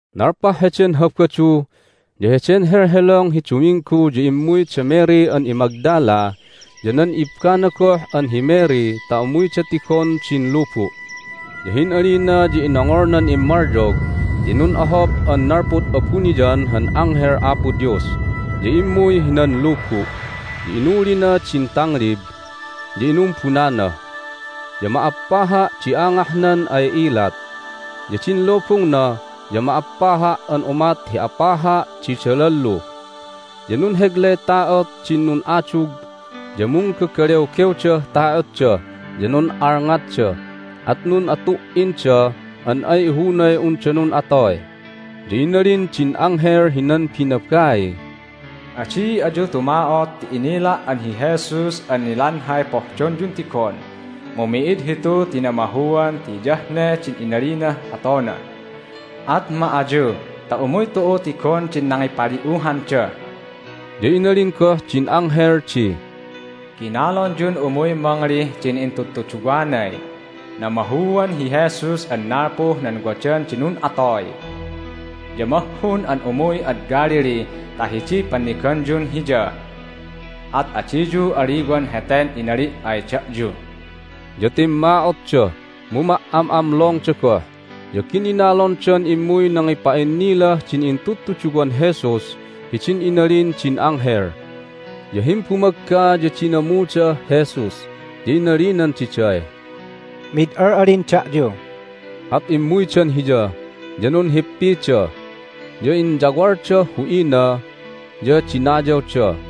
Nalpah heden Habadu. Ya heden helhelong hi Duminggu ya immuy da Mary an iMagdala ya nan ibbana goh an hi Mary ta umuyda tigon din lubu'. Ya hin'alina ya inongolnan immalyog ti nun'ohop an nalpud abuniyan han anghel Apo Dios, ya immuy hinan lubu', ya inulina din tanglib, ya inumbunana. Ya ma'appaha' di angahnan ay ilat, ya din lubungna ya ma'appaha' an umat hi apaha' di dalallu. Ya nunheglay ta'ot din nun'adug, ya munggagalewgewdah ta'otda, ya nun'alngatda, at nun'atu"inda an ay ihunay unda nun'atoy. Ya inalin din anghel hinan binabaiy, "Adi ayu tuma'ot ti inila' an hi Jesus an nilanhay pohdonyun tigon. Mu mi'id hitu ti namahuan ti hiyah ne din inalinah atona! At ma ayu ta umuy tu'u tigon din nangipali'uhanda." Ya inalin goh din anghel di, "Ginalonyun umuy mangalih din intudtuduwanay, Namahuan hi Jesus an nalpuh nan wadan di nun'atoy! Ya mahhun an umuy ad Galilee ta hidiy panniganyun Hiya. At adiyu aliwan heten inali' ay da'yu." Ya timma'otda, mu ma"am'amlongda goh, ya gininalondan immuy nangipa'innilah din intudtuduwan Jesus hidin inalin din anghel. Ya himbumagga ya dinamudah Jesus, ya inalinan diday, "Mid al'alin da'yu." At immuydan Hiya, ya nunhippida, ya inyawaldah hu'ina, ya dinayawda.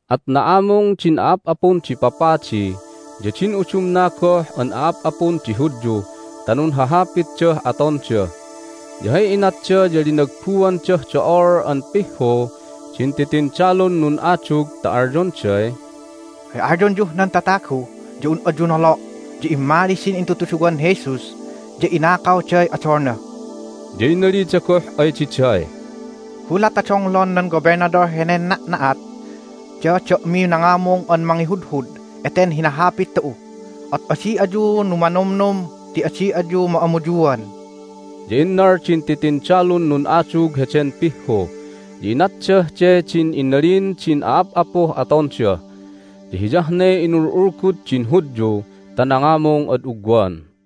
At na'amung din a'ap'apun di papadi ya din udumna goh an a'ap'apun di Hudyu ta nunhahapitdah atonda, ya hay inatda ya linagbuandah do'ol an pihhu din titindalun nun'adug ta alyonday, "Hay alyonyuh nan tatagu ya un ayu nolo' ya immali din intudtuduwan Jesus, ya inakawday odolna." Ya inalida goh ay diday, "Gulat ta donglon nan Gobelnadol henen na'na'at ya da'miy nangamung an mangihudhud eten hinahapit tu'u, at adi ayu numanomnom ti adi ayu ma'amuyuan." Ya innal din titindalun nun'adug heden pihhu, ya inatdah de din inalin din a'ap'apuh atonda. Ya hiyah ne inulgu'ulgud din Hudyu ta nangamung ad ugwan.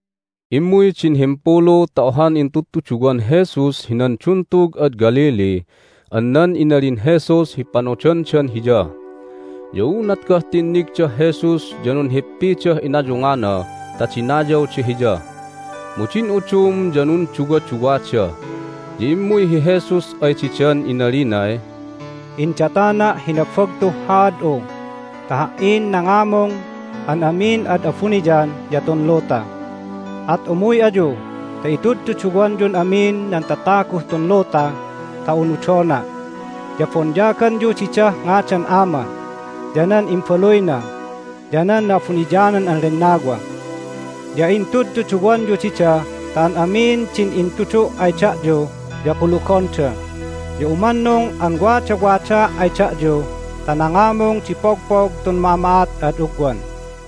Immuy din himpulu ta ohan intudtuduwan Jesus hinan duntug ad Galilee an nan inalin Jesus hi panodandan Hiya. Ya unat goh tinnigdah Jesus ya nunhippidah inayungana ta dinayawda Hiya. Mu din udum ya nunduwaduwada. Ya immuy hi Jesus ay didan inalinay, "Indatana' hi nabagtuh haad'u ta Ha"in nangamung an amin ad abuniyan ya tun luta. At umuy ayu ta intudtuduwanyun amin nan tataguh tun luta ta unudona', ya bonyaganyu didah ngadan Ama, ya nan Imbaluyna, ya nan Na'abuniyanan an Lennawa. Ya intudtuduwanyu dida ta an amin din intudu' ay da'yu ya kulugonda. Ya umannung an wadawadaa' ay da'yu ta nangamung di pogpog tun ma'ama'at ad ugwan."